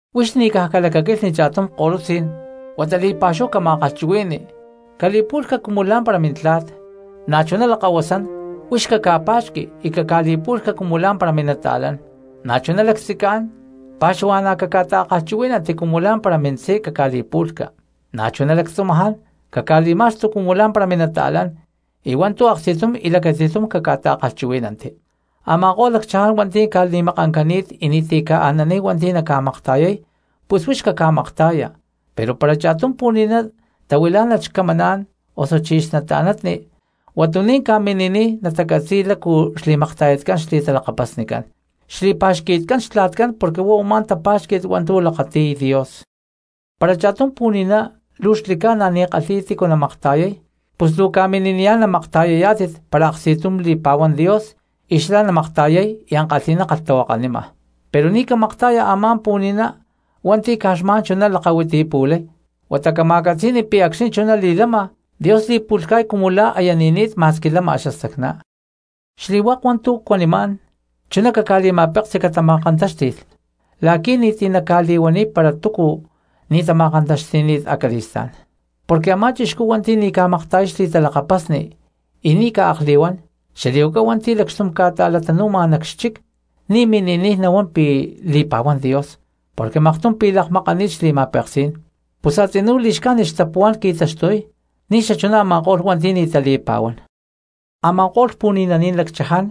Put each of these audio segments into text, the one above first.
Huix ni̠ caj calacaquilhni cha̠tum ko̠lutzí̠n huata li̠pa̠xúhu cama̠kalhchuhui̠ni cali̠pu̠lhca cumu lá̠mpara mintla̠t, na̠chuná lakahuasán huix caca̠pa̠xqui y caca̠li̠pu̠lhca cumu lá̠mpara minata̠lán. Na̠chuná lactzicán pa̠xuhua̠na̠ caca̠ta̠kalhchuhuí̠nanti cumu lá̠mpara mintzí caca̠li̠pu̠lhca, na̠chuná lactzumaján caca̠li̠ma̠xtu cumu lá̠mpara minata̠lán, y hua̠ntu̠ aksti̠tum y lacati̠tum caca̠ta̠kalhchuhuí̠nanti. Ama̠ko̠lh lacchaján hua̠nti̠ ca̠ni̠makancani̠t y ni̠ti̠ ca̠ananiy hua̠nti̠ naca̠makta̠yay, pus huix caca̠makta̠ya. Pero para cha̠tum pu̠ni̠ná tahuilá̠nalh xcamaná̠n osuchí xnata̠natni, huatuní̠n ca̠mini̠niy natacatzi̠y lácu xli̠makta̠yatcán xli̠talakapasnicán, xli̠pa̠xqui̠tcán xtla̠tcán porque huá u̠má tapa̠xqui̠t hua̠ntu̠ lakati̠y Dios. Para cha̠tum pu̠ni̠ná luu xli̠ca̠na ni̠ kalhi̠y tícu namakta̠yay, pus luu ca̠mini̠niyá̠n namakta̠yayá̠tit para aksti̠tum li̠pa̠huán Dios pi̠ xlá namakta̠yay y ankalhi̠ná kalhtahuakanima. Pero ni̠ camakta̠ya a̠má pu̠ni̠ná hua̠nti̠ caj xma̠n chuná lakahuitipu̠lay, huata cama̠catzi̠ni pi̠ acxni̠ chuná li̠lama Dios li̠pu̠lhca̠y cumu la̠ aya ni̠ni̠t ma̠squi lama xastacná. Xli̠hua̠k u̠má hua̠ntu̠ cuanimá̠n chuná caca̠li̠ma̠peksi catama̠kantáxti̠lh la̠qui̠ ni̠ti̠ naca̠li̠huaniy para túcu ni̠ tama̠kantaxti̠ni̠t acali̠stá̠n. Porque a̠má cristiano hua̠nti̠ ni̠ ca̠makta̠yay xli̠talakapasni y ni̠ ca̠akli̠huán, xali̠huaca hua̠nti̠ lacxtum ca̠ta̠latanu̠ma nac xchic, ni̠ mini̠niy nahuán pi̠ li̠pa̠huán Dios porque maktum pi̠ lakmakani̠t xli̠ma̠peksí̠n, pus a̠tzinú li̠xcájnit xtapuhuá̠n qui̠taxtuy ni̠ xachuná a̠ma̠ko̠lh hua̠nti̠ ni̠ tali̠pa̠huán. Ama̠ko̠lh puhuani̠naní̠n lacchaján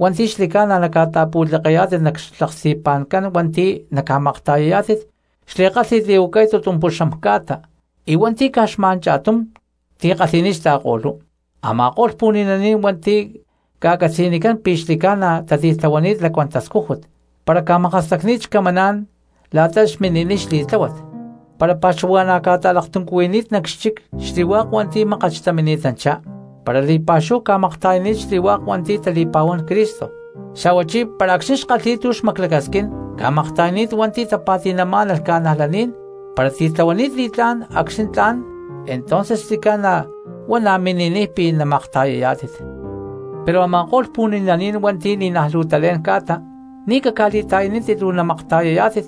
hua̠nti̠ xli̠ca̠na naca̠ta̠pu̠tlekeyá̠tit nac xlaksti̠pa̠ncán hua̠nti̠ naca̠makta̠yayá̠tit xli̠kálhi̠t li̠huacay tutumpuxam ca̠ta y hua̠nti̠ caj xma̠n cha̠tum tikalhi̠ni̠t xta̠ko̠lú. Ama̠ko̠lh pu̠ni̠naní̠n hua̠nti̠ ca̠catzi̠nicán pi̠ xli̠ca̠na tatitlahuani̠t lacuán tascújut, para ca̠makastacni̠t xcamaná̠n la̠ta xmini̠niy xli̠tláhuat, para pa̠xuhua̠na̠ ca̠ta̠laktuncuhuini̠t nac xchic xli̠hua̠k hua̠nti̠ mákat xtamini̠tanchá, para li̠pa̠xúhu ca̠makta̠yani̠t xli̠hua̠k hua̠nti̠ tali̠pa̠huán Cristo, xa̠huachí para acxni̠ xkalhi̠y tu̠ xmaclacasquín ca̠makta̠yani̠t hua̠nti̠ tapa̠ti̠namá̠nalh cristianos, para titlahuani̠t li̠tlá̠n acxni̠ tla̠n entonces xli̠ca̠na huá na̠ mini̠niy pi̠ namakta̠yayá̠tit. Pero a̠ma̠ko̠lh pu̠ni̠naní̠n hua̠nti̠ ni̠naj luu talé̠n ca̠ta ni̠ caca̠li̠ta̠yanítit luu namakta̠yayá̠tit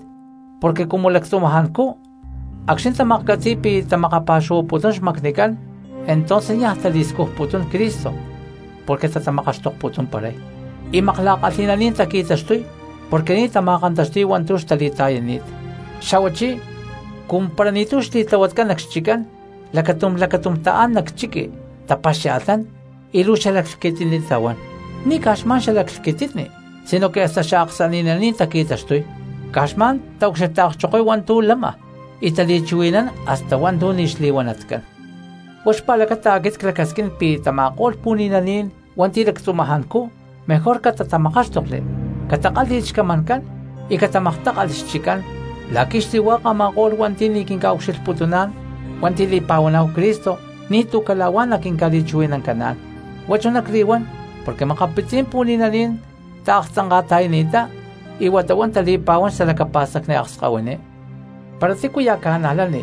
porque cumu lactzumajancú acxni̠ tamaklhcatzi̠y pi̠ tamakapa̠xuhuaputún xmacnicán entonces niaj tali̠scujputún Cristo porque tatamakaxtokputumparay, y makla̠kalhi̠naní̠n taqui̠taxtuy porque ni̠ tama̠kantaxti̠y hua̠ntu̠ xtali̠ta̠yani̠t. Xa̠huachí cumu para ni̠tu̠ xli̠tlahuatcán nac xchiccán lacatum lacatúm taán nac chiqui tapaxia̠lhnán y luu xalaclhquititni tahuán, ni̠ caj xma̠n xalaclhquititni sinoque hasta xaaksani̠naní̠n taqui̠taxtuy, caj xma̠n taucxilhta̠kchokoy hua̠ntu̠ lama y tali̠chuhui̠nán hasta hua̠ntu̠ ni̠ xli̠huanatcán. Huá xpa̠lacata aquit clacasquín pi̠ tama̠ko̠lh pu̠ni̠naní̠n hua̠nti̠ lactzumajancú mejor catatamakáxtokli, catakálhi̠lh xcamancán y catamaktákalhli xchiccán la̠qui̠ xli̠hua̠k a̠ma̠ko̠lh hua̠nti̠ ni̠ quinca̠ucxilhputuná̠n hua̠nti̠ li̠pa̠huaná̠hu Cristo ni̠tu̠ cala̠huá naquinca̠li̠chuhui̠nancaná̠n. Huá chuná cli̠huán porque makapitzí̠n pu̠ni̠naní̠n taaktzanka̠ta̠yani̠ttá y huata huá tali̠pa̠huán xtalacapa̠stacni akskahuiní. Para tícuya̠ cristiano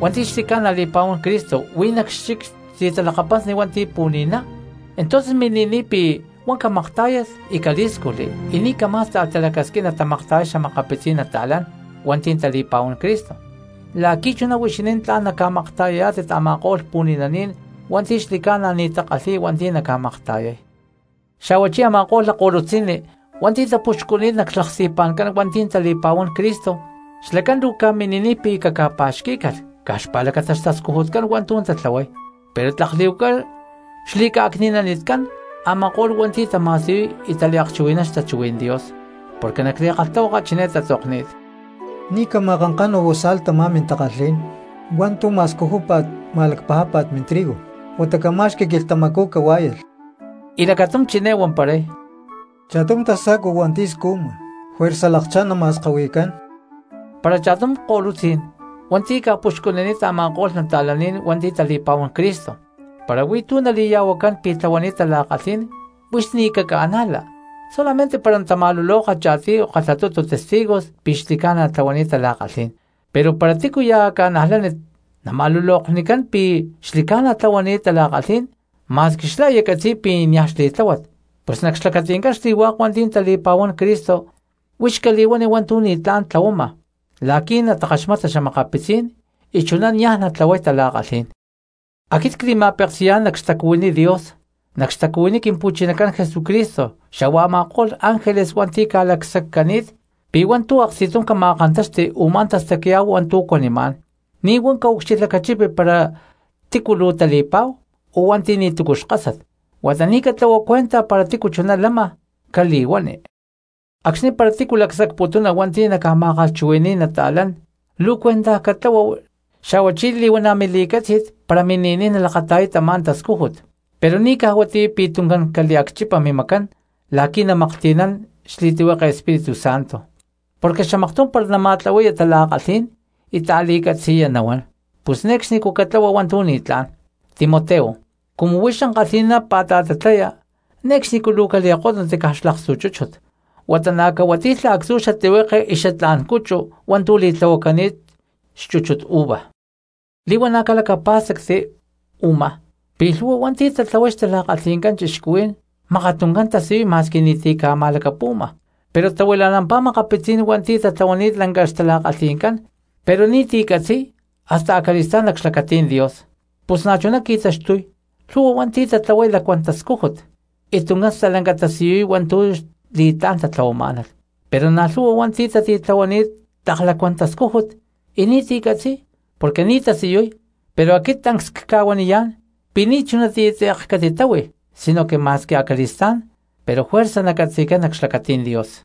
hua̠nti̠ xli̠ca̠na li̠pa̠huán Cristo huí nac xchic xli̠talakapasni hua̠nti̠ pu̠ni̠ná, entonces mini̠niy pi̠ huá camaktá̠yalh y calí̠scujli y ni̠ camá̠sta̠lh talacasquín natamakta̠yay xa̠makapitzí̠n cristianos hua̠nti̠ tali̠pa̠huán Cristo, la̠qui̠ chuná huixinín tla̠n naca̠makta̠yayá̠tit a̠ma̠ko̠lh pu̠ni̠naní̠n hua̠nti̠ xli̠ca̠na ni̠ takalhi̠y hua̠nti̠ naca̠makta̠yay. Xa̠huachí a̠ma̠ko̠lh lakko̠lutzi̠nni hua̠nti̠ tapuxcuni̠t nac xlaksti̠pa̠ncán hua̠nti̠ tali̠pa̠huán Cristo, xlacán luu ca̠mini̠niy pi̠ caca̠pa̠xquí̠calh caj xpa̠lacata xtascujutcán hua̠ntu̠ tatlahuay, pero tlak li̠huaca xli̠ca̠cni̠nanitcán a̠ma̠ko̠lh hua̠nti̠ tama̠siyuy y taliakchuhui̠nán xtachuhuí̠n Dios. Porque nac li̠kalhtahuaka chiné tatzokni̠t: “Ni̠ cama̠kankanu bozal tamá mintakalhí̠n hua̠ntu̠ ma̠scujúpa̠t ma̠lacpajápa̠t mintrigo huata camá̠xqui̠lh quilhtamacú cahuá̠yalh.” Y lacatum chiné huamparay: “Cha̠tum tasa̠cua hua̠nti̠ scujma juerza lakchá̠n nama̠skahui̠cán.” Para cha̠tum ko̠lutzí̠n hua̠nti̠ ca̠puxcunini̠t a̠ma̠ko̠lh cristianos hua̠nti̠ tali̠pa̠huán Cristo para huí tu̠ nali̠ya̠huacán pi̠ tlahuani̠t tala̠kalhí̠n, huix ni̠ caca̠najla solamente para natama̠luloka cha̠tiy o kalhatutu testigos pi̠ xli̠ca̠na tlahuani̠t tala̠kalhí̠n. Pero para tícuya̠ cristiano nama̠luloknicán pi̠ xli̠ca̠na tlahuani̠t tala̠kalhí̠n ma̠squi xlá aya catzi̠y pi̠ niaj xli̠tláhuat, pus nac xlacati̠ncán xli̠hua̠k hua̠nti̠ tali̠pa̠huán Cristo huix cali̠huani hua̠ntu̠ ni̠tlá̠n tlahuama la̠qui̠ natakaxmata xa̠makapitzí̠n y chuná natlahuay tala̠kalhí̠n. Aquit cli̠ma̠peksi̠yá̠n nac xtacuhuiní Dios, nac xtacuhuiní Quimpu̠chinacán Jesucristo xa̠hua a̠ma̠ko̠lh ángeles hua̠nti̠ ca̠lacsaccani̠t, pi̠ hua̠ntu̠ aksti̠tum cama̠kántaxti u̠má tastacya̠hu hua̠ntu̠ cuanimá̠n; ni̠ huá caucxilhlacachipi para tícu luu tali̠pa̠hu o hua̠nti̠ ni̠tu̠cu xkasat, huata ni̠ catlahua mincuenta para tícu chuná lama cali̠huani. Acxni̠ para tícu lacsacputuna hua̠nti̠ naca̠ma̠kalhchuhui̠ni̠y cristianos, luu cuentaj catlahua xa̠huachí li̠huana̠ mili̠cátzi̠t para mini̠niy nalakata̠yay tamá tascújut, pero ni̠ caj huatiyá pi̠ tuncán caliacchipa mimacán la̠qui̠ namaklhti̠nán xli̠tlihueke Espíritu Santo, porque xamaktum para nama̠tlahui̠yá̠n tala̠kalhí̠n y ta̠li̠catzi̠ya nahuán; pus ne̠cxnicú catlahua hua̠ntu̠ ni̠tlá̠n. Timoteo, cumu huix ankalhi̠ná pa̠ta̠tatlaya, ne̠cxnicú luu cali̠kótnunti caj xlakstu chúchut, huata na̠ cahuati̠lha actzu̠ xatlihueke vino hua̠ntu̠ li̠tlahuacani̠t xchúchut uva. Li̠huana̠ calacapá̠stacti u̠má pi̠ lhu̠hua hua̠ntu̠ tatlahuay xtala̠kalhi̠ncán cristianos mákat tuncán tasiyuy ma̠squi ni̠ti̠ ca̠ma̠lacapu̠ma, pero tahuila̠nampá makapitzí̠n hua̠nti̠ tatlahuani̠t lanca xtala̠kalhi̠ncán pero ni̠ti̠ nacatzi̠y hasta acali̠stá̠n nac xlacatí̠n Dios. Pus na̠chuná qui̠taxtuy lhu̠hua hua̠nti̠ tatlahuay lacuán tascújut y tuncán stalanca tasiyuy hua̠ntu̠ xli̠tlá̠n tatlahuamá̠nalh, pero na̠ lhu̠hua hua̠nti̠ tatitlahuani̠t tlak lacuán tascújut y ni̠ti̠ catzi̠y porque ni̠ tasiyuy, pero aquit tancs cca̠huaniyá̠n pi̠ ni̠ chunatiyá tze̠k catitáhui sinoque ma̠squi acali̠stá̠n pero juerza nacatzi̠cán nac xlacatí̠n Dios.